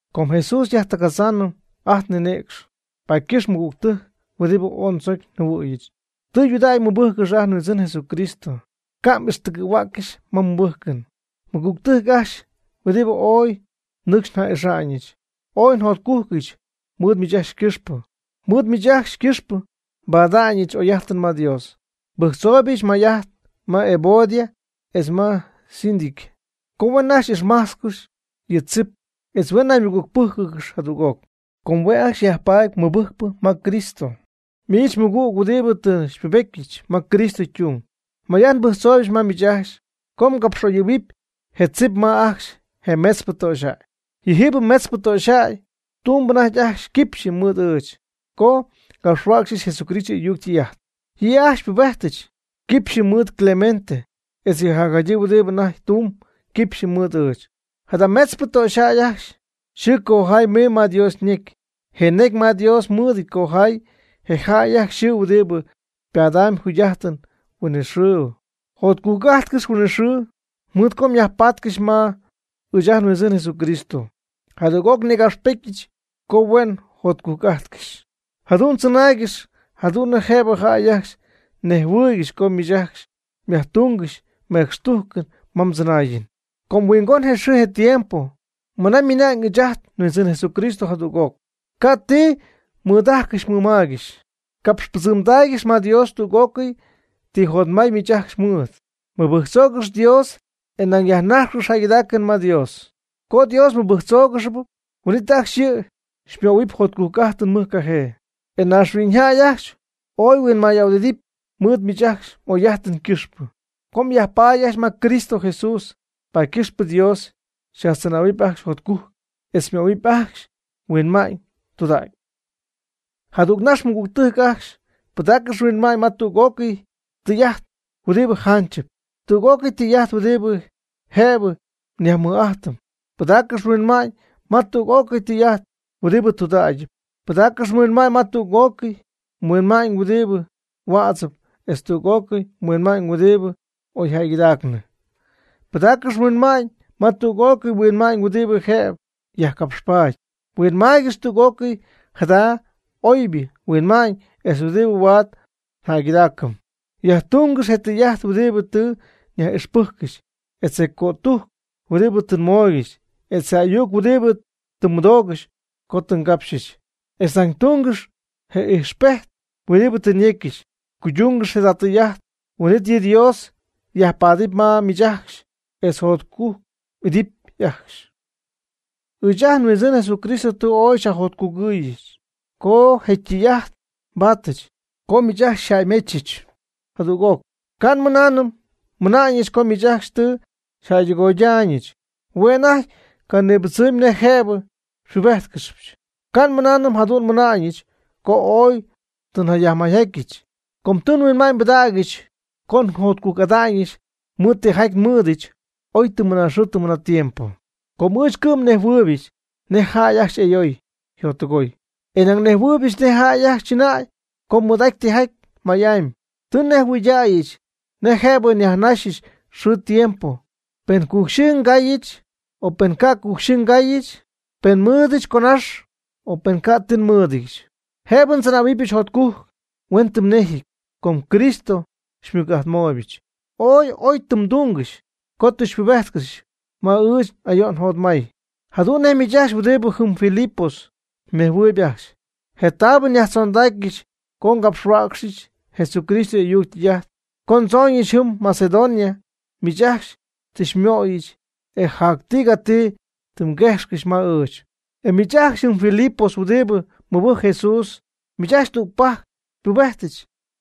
Com Jesús xyajtɨgadzaanɨm ajt nninïcx, paady ycɨxpɨ mɨgügtɨjc huɨdibɨ ooy ndzocy njɨhuɨ̈yɨch, tɨydudägy mɨbɨjccɨx ajt nHuindzɨn Jesucristo, ca' m'ixtɨgɨ̈huäccɨxy ma mmɨbɨjcɨn. Mɨgügtɨjc ajcxy huɨdibɨ ooy nɨcxy nja'ixa'ñɨch, ooy njotcujc'atyɨch mɨɨd miich ajcxy ycɨxpɨ. Mɨɨd miich ajcxy ycɨxpɨ nbada'ñɨch n'oy'ajtɨn ma Dios. Nbɨjctzooybɨch may'ajt ma Evodia etz ma Síntique co huen ajcxy ixmajtzcɨxy yɨ tzip etz huen naymɨgügpɨ́jcɨgɨxy jadüg'oc, com hue'ajcxy yajpaady mɨbɨjcpɨ ma Cristo. Miich mɨgüg huɨdibɨ tɨ xypubetyɨch ma Cristo ytung, may'ajt nbɨjctzooybɨch ma miich co mgapx'oyɨ̈huɨpy je tzip ma ajcxy je metzpɨ töxyjäy. Yɨjiibɨ metzpɨ töxyjäy tumb anajty ajcxy quipxyɨ mɨɨd ɨɨch co ngapxhuäcxyɨch Jesucristo y'ayuc ytɨy'ajt. Yɨ' ajcxy xypubejtɨch quipxyɨ mɨɨd Clemente etz yɨ jacjadyii huɨdibɨ anajty tumb quipxyɨ mɨɨd ɨɨch. Jada metzpɨ töxyjäy ajcxy yxɨɨ ycojayɨ̈y ymiiñ ma Dios ñecy, je necy ma Dios mɨɨdɨty cojay je jäy ajcxy yxɨɨ huɨdibɨ padamb jugy'ajtɨn huinɨxɨɨbɨ. Jotcujc'ajtcɨx huinɨxɨɨ, mɨɨd co myajpatcɨxy ma ɨɨch ajt nHuindzɨn Jesucristo. Jadüg'oc nïgapxpetyɨch co huen jotcujc'ajtcɨxy. Jadu'n tzɨnaaygɨx jadu'n nej jëbɨ jäy ajcxy nejhuɨɨygɨxy co miich ajcxy myajtungɨxy mecxtujcɨn ma mdzɨnaayɨn. Com huingon je xɨɨ je tiempo mɨna ymiina'ñ ɨɨch ajt nHuindzɨn Jesucristo jadüg'oc. Ca' ni ti mnidajcɨxy mnimaygɨxy. Capxpɨdzɨmdaaygɨx ma Dios tüg'ócɨy ti jotmay miich ajcxy mmɨɨd. Mɨbɨjctzoogɨx Dios, e nañ yajnajxcɨx jäygɨdaacɨn ma Dios. Co Dios mmɨbɨjctzóogɨxɨpy, huin'it ajcxy yɨ' xymöhuɨp jotcujc'ajtɨn mɨjcajee, e mayñaaxhuiñyjäy ajcxy ooy yhuinmay ahuɨdidɨpy mɨɨd miich ajcxy m'oy'ajtɨn ycɨxpɨ. Co myajpaady ajcxy ma Cristo Jesús, paady ycɨxpɨ Dios xyajtzɨnähuɨpy ajcxy jotcujc etz xymöhuɨp ajcxy huinma'ñ tudägypɨ. Jadügnax, mɨgügtɨjc ajcxy, pɨdaaccɨx mhuinma'ñ ma tüg'ócɨy tɨy'ajt huɨdibɨ janchɨp, tüg'ócɨy tɨy'ajt huɨdibɨ jëbɨ nyajmɨj'ajtɨm. Pɨdaaccɨx mhuinma'ñ ma tüg'ócɨy tɨy'ajt huɨdibɨ tudägyɨp. Pɨdaaccɨx mhuinma'ñ ma tüg'ócɨy huinma'ñ huɨdi huädzɨp etz tüg'ócɨy huinma'ñ huɨdi oy jäygɨdaacnɨ. Pɨdaaccɨx mhuinma'ñ ma tüg'ócɨy huinma'ñ huɨdibɨ jëbɨ yajcapxpaady. Huinmaaygɨx tüg'ócɨy jada oybɨ huinma'ñ etz huɨdibɨ huaad njäygɨdaacɨm. Yajtungɨx je tɨy'ajt huɨdibɨ tɨ nyaj'ixpɨjcɨxy, etz je cötujc huɨdibɨ tɨ nmooygɨxy, etz je ayuc huɨdibɨ tɨ mmɨdoogɨxy co tɨ ngapxyɨch. Etz nañ tungɨx je ijxpejt huɨdibɨ tɨ nyecyɨch. Cuydungɨx jada tɨy'ajt, huin'it yɨ Dios yajpaadɨpy ma miich ajcxy etz xyajjotcujc'idɨpy ajcxy. Ɨɨch ajt nHuindzɨn Jesucristo tɨ ooy xyajjotcugɨ̈yɨch co je tɨy'ajt xypaadyɨch co miich ajcxy xyjäymechɨch jadüg'oc. Ca' nmɨnaanɨm nmɨna'ñɨch co miich ajcxy tɨ xyjäydɨgoydaayñɨch. Hue' anajty ycanibɨdzɨmy nej jëbɨ xypubejtcɨxyɨch. Ca' nmɨnaanɨm jadu'n nmɨna'ñɨch co ooy ti jaty nyajmayjajtnɨch. Com tɨ nhuinma'ñ nbɨdägyɨch co njotcujc'adɨpyɨch mɨɨd tijaty nmɨɨdɨch, oy tɨm mɨnaaxɨɨ tɨm mɨnaatiempo. Com ɨɨch cɨ'm nejhuɨɨybɨch nej jay ajcxy y'ayoy yjottɨgooy, e nañ nejhuɨɨybɨch nej jäy ajcxy chɨnäy co mɨɨd'aty tijaty may'amy. Tɨ nnejhuɨɨydäyɨch nej jëbɨ ndzɨnäyɨch, nej jëbɨ nyajnajxɨch xɨɨ tiempo; pen cu'xyɨ ngaayɨch, o pen ca' cu'xyɨ ngayɨch, pen nmɨɨdɨch conax, o pen ca' ti nmɨ́ɨdɨdyɨch. Jëbɨ ndzɨnähuɨbɨch jotcujc huenti huennejɨty, com Cristo xymɨc'ajtmooybɨch. Ooy oy tɨ mdungɨxy co tɨ xypubéjtcɨxyɨch ma ɨɨch n'ayo'n njotmay. Jadu'n nej miich ajcxy huɨdi jɨm Filipos mnejhuɨɨyb ajcxy, je taabɨ nyajtzondacyɨch co ngapxhuäcxyɨch Jesucristo y'ayuc ytɨy'ajt, co ndzooñɨch jɨm Macedonia miich ajcxy tɨ xymɨyoxyɨch, e jac tigati tɨ mguejxcɨxy ma ɨɨch. E miich ajcxy jɨm Filipos huɨdibɨ mɨbɨjcp Jesús, miich ajcxy tügpajc xypubejtɨch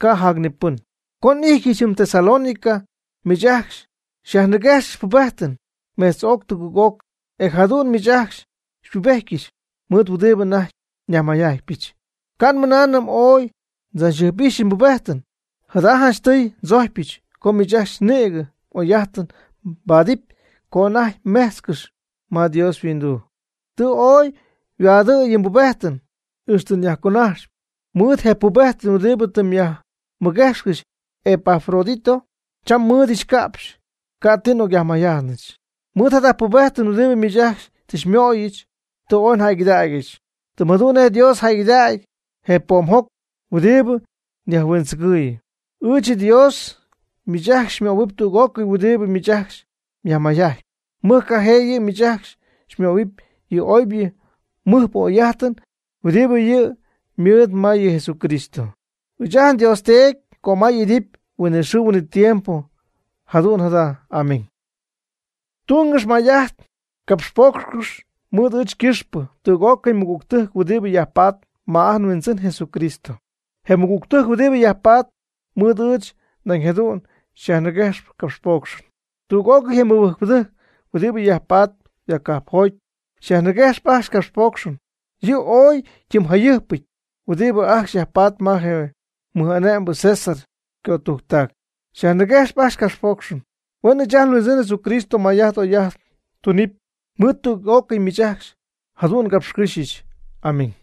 ca' jac ni pɨn. Co n'ijtyɨch jɨm Tesalónica miich ajcxy xyajniguejxyɨch pubejtɨn metz'oc tugɨɨg'oc, e jadu'n miich ajcxy xypubejtyɨch mɨɨd huɨdibɨ anajty nyajmayjajtpɨch. Ca' nmɨnaanɨm ooy ndzachjɨjp'ixynɨch pubejtɨn, jada janchtɨy ndzojcpyɨch co miich ajcxy nïgɨ oy'ajtɨn mbaadɨpy co anajty mmejtzcɨxy ma Dios yhuinduu. Tɨ ooy yhuaadɨ̈y yɨ mbubejtɨn ixtɨ nyajconajxpɨch. Mɨɨd je pubejtɨn huɨdibɨ tɨ myajmɨguejxcɨxy Epafrodito cham nmɨ́ɨdɨdyɨch ca'pxy, ca'ti n'ocyajmayjajtnɨch. Mɨɨd jada pubejtɨn huɨdibɨ miich ajcxy tɨ xymöyɨch, tɨ ooy njäygɨdägyɨch, tɨm jadu'n nej Dios jäygɨdacy je poomjoc huɨdibɨ yajhuindzɨgɨɨyɨ. Ɨɨch nDios miich ajcxy xymöhuɨp tüg'ócɨy huɨdibɨ miich ajcxy myajmayjajtpy. Mɨjcajee yɨ' miich ajcxy xymöhuɨp yɨ oybɨ mɨjpɨ oy'ajtɨn huɨdibɨ yɨ' ymɨɨd ma yɨ Jesucristo. ¡Huen ɨɨch ajt nDios Teedy cömay'idɨpy huinɨxɨɨ huinɨtiempo! Jadu'n jada. Amén. Tungɨx may'ajt capxpoocxcɨx mɨɨd ɨɨch ycɨxpɨ tüg'ócɨy mɨgügtɨjc huɨdibɨ yajpatp ma ajt nHuindzɨn Jesucristo. Je mɨgügtɨjc huɨdibɨ yajpatp mɨɨd ɨɨch nañ jadu'n xyajniguejxcɨxy capxpoocxɨn. Tüg'ócɨy je mɨbɨjcpɨdɨjc huɨdibɨ yajpatp ya cajpjoty xyajniguejxp ajcxy capxpoocxɨn, yɨ' ooy ytimyjayɨjpɨty huɨdibɨ ajcxy yajpatp ma je mɨj ane'mbɨ César ycötujctac xyajniguejxyp ajcxy capxpoocxɨn. Huen ɨɨch ajt nHuindzɨn Jesucristo may'ajt oy'ajt tunɨpy mɨɨd tüg'ócɨy miich ajcxy. Jadu'n ngapxycɨ́xyɨch. Amén.